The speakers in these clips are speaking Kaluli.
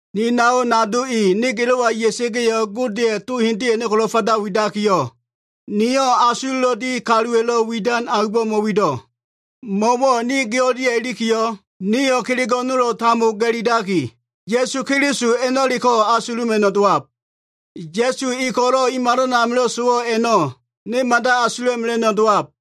Ni nao nado i, ne gilo꞉wa ya꞉sa꞉ga꞉yo꞉, Godeya꞉ to hendele a꞉no꞉ ko꞉lo꞉ kalaba widakiyo꞉, niyo꞉ asulo꞉lo꞉ di kaluwa꞉lo꞉ widan aumbo꞉ mo꞉wido꞉. Mo꞉wo꞉ ne gi o꞉lia꞉ ilikiyo꞉, niyo꞉ kelego꞉ nolo꞉ tambo ga꞉lilaki, Ya꞉su Keliso a꞉no꞉leko꞉ asula꞉mela꞉no꞉ dowab. Ya꞉su e ko꞉lo꞉ i malan amilo꞉ sowo꞉ a꞉no꞉, ne mada asula꞉mela꞉no꞉ dowab.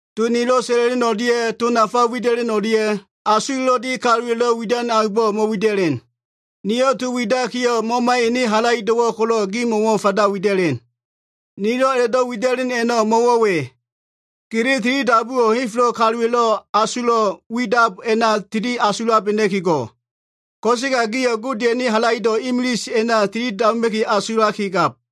To nilo꞉ sa꞉la꞉len o꞉lia꞉ to nafa wida꞉len o꞉lia꞉, asulo꞉lo꞉ di kaluwa꞉lo꞉ widan aumbo꞉ mo꞉wida꞉len. Niyo꞉ to widakiyo꞉, Mamaya꞉ ene halaido꞉wo꞉ ko꞉lo꞉ gimo꞉wo꞉ fanda wida꞉len. Nilo꞉ a꞉la꞉do꞉ wida꞉len a꞉no꞉ mo꞉wo꞉ we. Gili tilidabuwo꞉ henfelo꞉ kaluwa꞉lo꞉ asulo꞉ widab a꞉na tili asulabena꞉ki go꞉. Ko꞉sega gio꞉ Godeya꞉ ene halaido꞉ imilise a꞉na tilidabuma꞉ki asulab.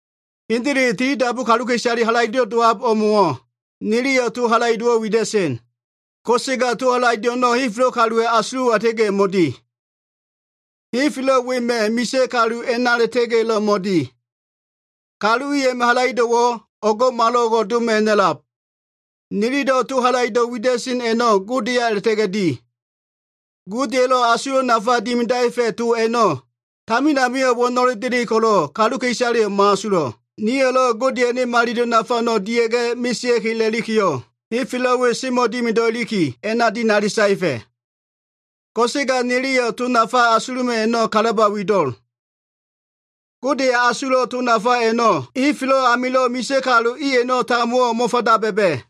Hendele, tilidabu kaluka꞉isale halaido꞉lo꞉ dowab o꞉mo꞉wo꞉, niliyo꞉ to halaido꞉wo꞉ wida꞉sen. Ko꞉sega to halaido꞉ a꞉no꞉, henfelo꞉ kaluwa꞉ asulo꞉wa a꞉la꞉ta꞉ga꞉yo꞉ mo꞉di. Henfelo꞉ wema꞉ misa꞉ kalu a꞉na a꞉la꞉ta꞉ga꞉yo꞉lo꞉ mo꞉di. Kalu i a꞉ma꞉ halaido꞉wo꞉ o꞉ngo꞉malo꞉ngo꞉ doma꞉ ha꞉na꞉lab. Nililo꞉ to halaido꞉ wida꞉sen a꞉no꞉ Godeya a꞉la꞉ta꞉ga꞉ di. Godeya꞉lo꞉ asulo꞉ nafa dimidaefa꞉ to a꞉no꞉, tamin amio꞉ wo꞉no꞉le delen ko꞉lo꞉, kaluka꞉isaleyo꞉ mo꞉asulo꞉. Nio꞉lo꞉ Godeya꞉ ene malilo꞉ nafa a꞉no꞉ dia꞉ga꞉ mesea꞉ki a꞉la꞉likiyo꞉, henfelo꞉ we semo꞉ dimido꞉ iliki, a꞉na dinali saefa꞉. Ko꞉sega o꞉go꞉ niliyo꞉ asuluma꞉no꞉ to nafa a꞉no꞉ kalaba fanda wido꞉l. Godeya꞉ asulo꞉ to nafa a꞉no꞉ henfelo꞉ amilo꞉ misa꞉ kalu i a꞉no꞉ tambowo꞉ mo꞉fanda ba꞉ba꞉.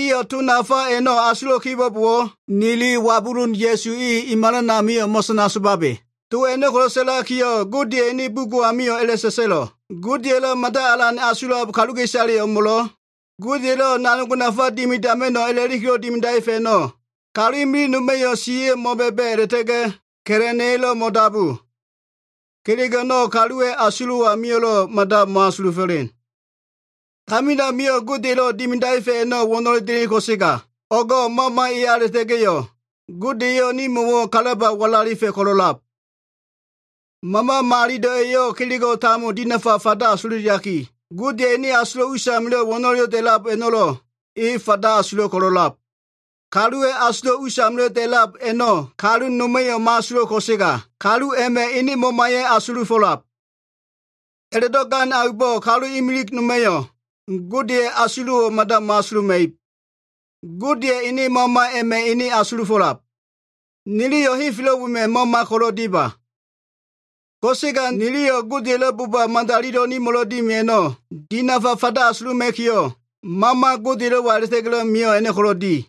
Iyo꞉ to nafa a꞉no꞉ asulo꞉ kibo꞉bowo꞉, nili wabulun Ya꞉su e, i malan amio꞉ mo꞉sana somabe. To a꞉no꞉ ko꞉lo꞉ sa꞉lakiyo꞉, Godeya꞉ ene bugo꞉ amio꞉ towo꞉ a꞉la꞉sa꞉sa꞉lo꞉, “Godelo꞉ mada alan asulab kaluka꞉isale o꞉mo꞉lo꞉, Gode elo꞉ kelego꞉ nafa dimidama꞉no꞉ a꞉la꞉likilo꞉ dimidaefa꞉ a꞉no꞉, kalu imilig noma꞉yo꞉ siya꞉yo꞉ mo꞉ba꞉ba꞉ a꞉la꞉ta꞉ga꞉ ka꞉la꞉na꞉yo꞉lo꞉ mo꞉dabu. Kelego꞉ a꞉no꞉ kaluwa꞉ asulo꞉ amio꞉lo꞉ mada mo꞉asulufo꞉len.” Tamin amio꞉ Godeya꞉lo꞉ dimidaefa꞉ a꞉no꞉ wo꞉no꞉le delen ko꞉sega, o꞉go꞉ Mama eya a꞉la꞉ta꞉ga꞉yo꞉ Gode eyo꞉ nimo꞉wo꞉ kalaba walalifa꞉ ko꞉lo꞉lab. Mama Malilo꞉ eyo꞉ kelego꞉ tambo dinafa fanda asululiaki, Godeya꞉ ene asulo꞉ usamilo꞉ wo꞉no꞉lelo꞉ da꞉lab a꞉no꞉lo꞉ e fanda asulo꞉ ko꞉lo꞉lab. Kaluwa꞉ asulo꞉ usamilo꞉ da꞉lab a꞉no꞉ kalu noma꞉yo꞉ mo꞉asulo꞉ ko꞉sega, kalu a꞉ma꞉ ene mamaya꞉ asulufo꞉lab. A꞉la꞉do꞉ gan aumbo꞉ kalu imilig noma꞉yo꞉ Godeya꞉ asulo꞉wo꞉ mada mo꞉asuluma꞉ib. Godeya꞉ ene Mama a꞉ma꞉ ene asulufo꞉lab. Niliyo꞉ henfelo꞉ wema꞉ mama ko꞉lo꞉ dima. Ko꞉sega niliyo꞉ Godeya꞉lo꞉ boba nimo꞉lo꞉ madalilo꞉ dimi a꞉no꞉ dinafa fanda asuluma꞉kiyo꞉, Mama Godelo꞉wa a꞉la꞉ta꞉ga꞉lo꞉ mio꞉ a꞉no꞉ ko꞉lo꞉ di.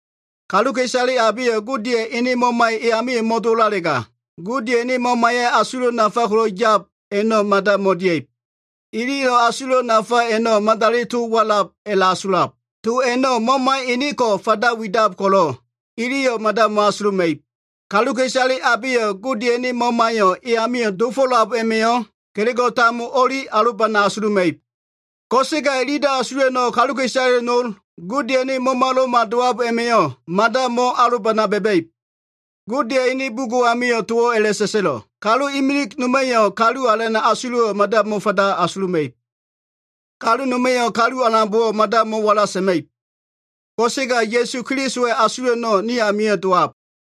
Kaluka꞉isale abeyo꞉ Godeya꞉ ene Mamayo꞉ e amio꞉ mo꞉dowo꞉lalega, Godeya꞉ ene Mamaya꞉ asulo꞉ nafa ko꞉lo꞉ yab a꞉no꞉ mada mo꞉dia꞉ib. Iliyo꞉ asulo꞉ nafa a꞉no꞉ madali to walab a꞉la꞉asulab. To a꞉no꞉ Mama enenko꞉ fanda widab ko꞉lo꞉, iliyo꞉ mada mo꞉asuluma꞉ib. Kaluka꞉isale abeyo꞉ Godeya꞉ ene Mamayo꞉ e amio꞉ dofo꞉lab a꞉ma꞉yo꞉, kelego꞉ tambo o꞉li alobana asuluma꞉ib. Ko꞉sega ililo꞉ asulo꞉ a꞉no꞉ kaluka꞉isale nol, Godeya꞉ Mamalo꞉ma dowab a꞉ma꞉yo꞉ mada mo꞉alobana ba꞉ba꞉ib. Godeya꞉ ene bugo꞉ amio꞉ towo꞉ a꞉la꞉sa꞉sa꞉lo꞉, “Kalu imilig noma꞉yo꞉ Kalu Alana꞉ asulo꞉wo꞉ mada mo꞉fanda asuluma꞉ib. Kalu noma꞉yo꞉ Kalu Alanbo꞉wo꞉ mada mo꞉wala sa꞉ma꞉ib.” Ko꞉sega Ya꞉su Kelisowa꞉ asulo꞉ a꞉no꞉ ni amio꞉ dowab.